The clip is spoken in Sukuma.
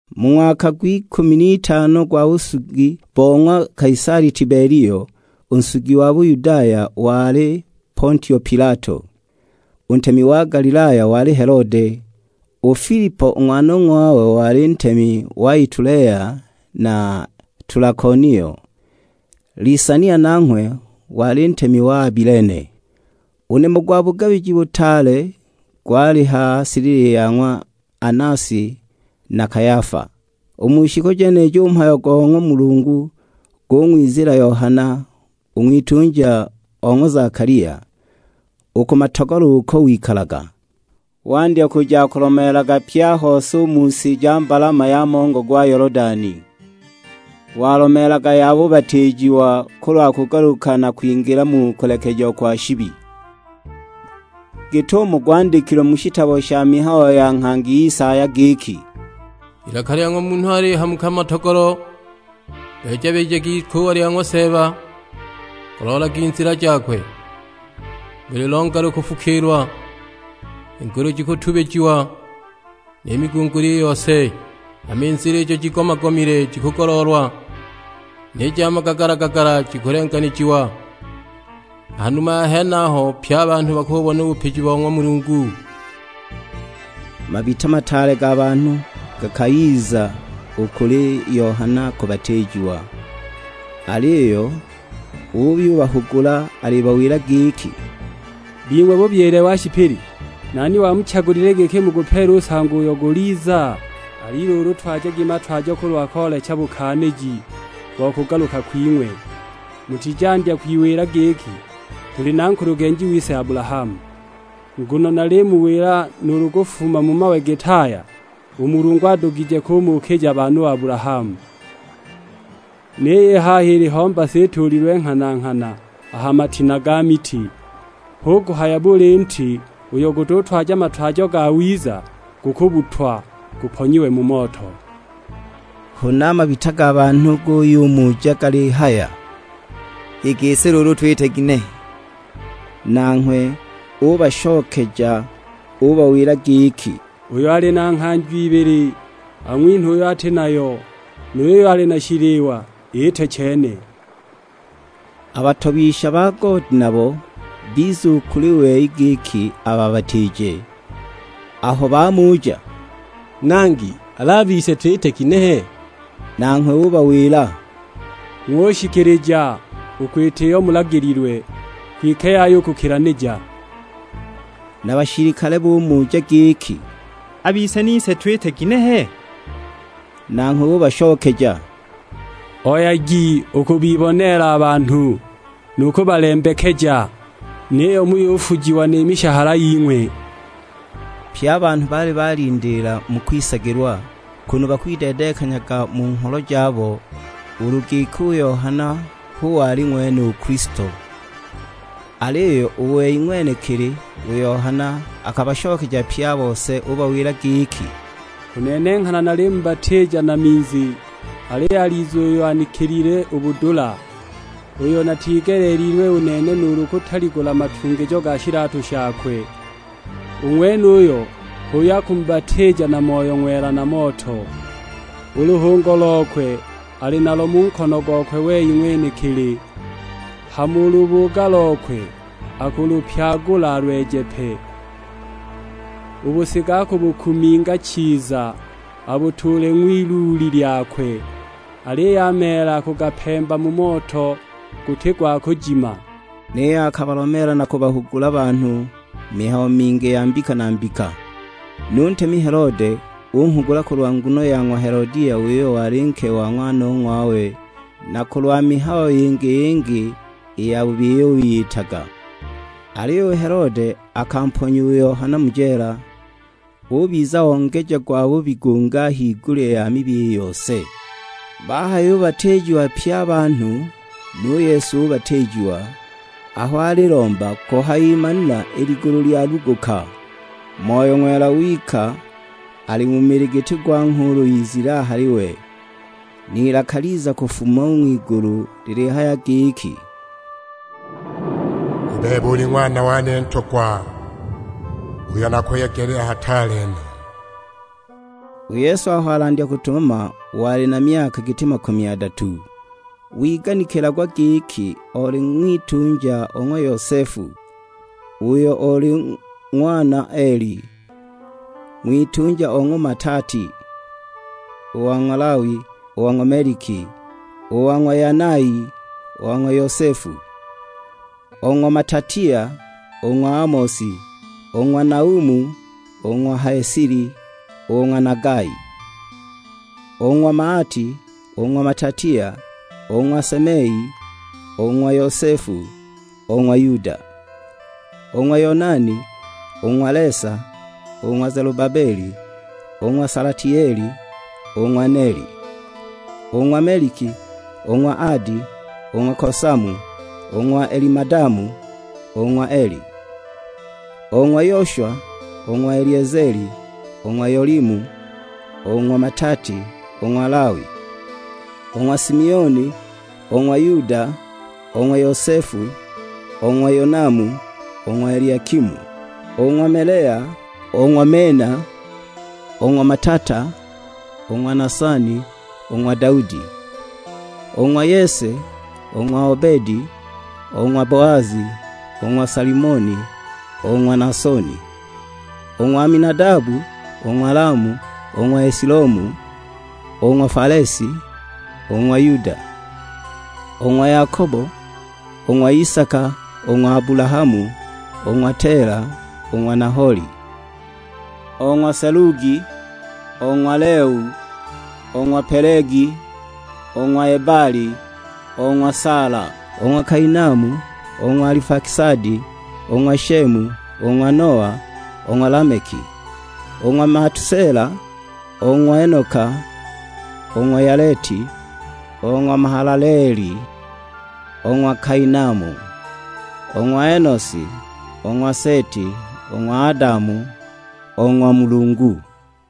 Mu ng'waka gw'ikumi n'itano gwa busugi bo ng'wa Kaisali Tibelio, u nsugi wa Buyudaya wali Pontio Pilato. U ntemi wa Galilaya wali Helode, u Filipo u ng'wanong'wawe wali ntemi wa Itulea na Tulakonio; Lisania nanghwe wali ntemi wa Abilene. U nimo gwa bugabiji butaale gwali ha silili ya ng'wa Anasi na Kayafa. U mu shiku jenijo u mhayo go ng'wa Mulungu gung'wiziila Yohana, u ng'witunja o ng'wa Zakalia, u ku matogolo uko wikalaga. Wandya kuja akulomeelaga pye a hose u mu si ja mbalama ya mongo gwa Yolodani. Walomeelaga ya bubatiijiwa kulwa kugaluka na kwingila mu kulekejiwa kwa shibi. Git'umo gwandikilwe mu shitabo sha mihayo ya nghangi Isaya giki, "Ilaka lya munhu alihamuka mu matogolo, beeja-beejagi ikuuwa lya ng'wa Seeba, goloolagi nzila jakwe. Buli longa lukufukiilwa, i ngulu jikutubijiwa, ni migunguli i yose; hama i nzila ijo jiigomagomile jikugoloolwa, ni ja magagala-gagala jikulenganijiwa. Ha numa ya henaho pye a banhu bakububona u bupiji bo ng'wa Mulungu." Mabita mataale ga banhu gakayiza u kuli Yohana kubatiijiwa, aliyo uyubahugula alibawila giki, "Bing'we bubyile wa shipili, nani wamuchagulile giki mugupeele u nsango uyo guliza? Ali luulu, twajagi matwajo kulwa koolecha bukaaniji bo kugaluka kwing'we. Mutizandya kwiwila giki, 'Tuli na nkulugenji wise Abulahamu.' Nguno nalimuwila nuulu kufuma mu mawe git'aya, u Mulungu adugije kumukija baana u Abulahamu. Niyo i haha iliho mbasa ituulilwe nghana-nghana a ha matina ga miti. Hu kuhaya buli nti uyo gututwaja matwajo gawiza, gukubbutwa, guponyiwe mu moto." Huna a mabita ga banhu guyumuja galihaya, "I gisi luulu twite ginehe?" Nanghwe ubashokeja ubawila giki, "Uyo ali na nghanjo ibili ang'winhe uyo ati nayo, nu yuyo ali na shiliwa iite chene." A batobisha ba goodi nabo biza u kuli we giki ababatiije. Aho bamuja, "Nangi, al'a bise twite ginehe?" Nanghwe ubawila, "Ng'ushikilija u kwita iyo mulagililwe, kwike yaya u kukilanija." Na bashilikale bumuja giki, "A bise nise twite ginehe?" Nanghwe ubashokeja, "Oyagi u kubiboneela a banhu, nu kubalembekeja, niyo muyufujiwa ni mishahala ying'we." Pye a banhu baali balindiila mu kwisagilwa, kunu bakwideedenghanyaga u mu ngholo jabo ulu giki u Yohana hu wali ng'wene u Kilisto. Aliyo u wei ng'wenekili u Yohana akabashokeja pye a bose ubawila giki, "U nene nghana nalimubatiija na minzi, aliyo aliza uyo anikilile u budula, uyo natigeleelilwe u nene nuulu kutaligula matungijo ga shilatu shakwe; u ng'wenuyo h'uyo akumubatiija na Moyo Ng'wela na moto. U luhungo lokwe ali nalo mu nkono gokwe wei ng'wenekili, hama u lubuuga lokwe akulupyagula alweje pe. U busiga akubukuminga chiza abutuule ng'wiluuli lyakwe; aliyo a meela akugapemba mu moto guti gwa kujima!" Niyo akabalomeela na kubahugula a banhu mihayo mingi ya mbika na mbika. Nu ntemi Helode unghugula kulwa nguno ya ng'wa Helodia uyo wali nke wa ng'wanong'wawe, na kulwa mihayo yingi-yingi i yabubi iyo wiyitaga. Aliyo u Helode akamponya u Yohana mu jeela, ubiza ongeja gwabubi gungi a higulya ya mibi i yose! Bahayubatiijiwa pye a banhu, nu Yesu ubatiijiwa; aho alilomba, kuhayimanila i ligulu lyaluguka. Moyo Ng'wela wika ali mu mili giti gwa nghuulu izile a hali we; n'ilaka liza kufuma u ng'wigulu lilihaya giki, "U bebe uli Ng'wana wane Ntogwa, uyo nakuyegelile hataale no." U Yesu aho alandya kutumama wali na myaka giti makumi adatu, wiganikilagwa giki oli ng'witunja o ng'wa Yosefu, uyo oli ng'wana Eli; ng'witunja o ng'wa Matati, o ng'wa Lawi, o ng'wa Meliki, o ng'wa Yanai, o ng'wa Yosefu. O ng'wa Matatia, o ng'wa Amosi, o ng'wa Naumu, o ng'wa Hesili, o ng'wa Nagai. O ng'wa Maati, o ng'wa Matatia, o ng'wa Semei, o ng'wa Yosefu, o ng'wa Yuda. O ng'wa Yonani, o ng'wa Lesa, o ng'wa Zelubabeli, o ng'wa Salatieli, o ng'wa Neli. O ng'wa Meliki, o ng'wa Adi, o ng'wa Kosamu, o ng'wa Elimadamu, o ng'wa Eli. O ng'wa Yoshwa, o ng'wa Eliezeli, o ng'wa Yolimu, o ng'wa Matati, o ng'wa Lawi. O ng'wa Simioni, o ng'wa Yuda, o ng'wa Yosefu, o ng'wa Yonamu, o ng'wa Eliakimu. O ng'wa Melea, o ng'wa Mena, o ng'wa Matata, o ng'wa Nasani, o ng'wa Daudi. O ng'wa Yese, o ng'wa Obedi, o ng'wa Boazi, o ng'wa Salimoni, o ng'wa Naasoni. O ng'wa Aminadabu, o ng'wa Lamu, o ng'wa Esilomu, o ng'wa Falesi, o ng'wa Yuda. O ng'wa Yakobo, o ng'wa Isaka, o ng'wa Abulahamu, o ng'wa Tela, o ng'wa Naholi. O ng'wa Selugi, o ng'wa Leu, o ng'wa Pelegi, o ng'wa Ebali, o ng'wa Saala. O ng'wa Kainamu, o ng'wa Alifakisadi, o ng'wa Shemu, o ng'wa Noa, o ng'wa Lameki. O ng'wa Matusela, o ng'wa Enoka, o ng'wa Yaleti, o ng'wa Mahalaleeli, o ng'wa Kainamu. O ng'wa Enosi, o ng'wa Seti, o ng'wa Adamu, o ng'wa Mulungu.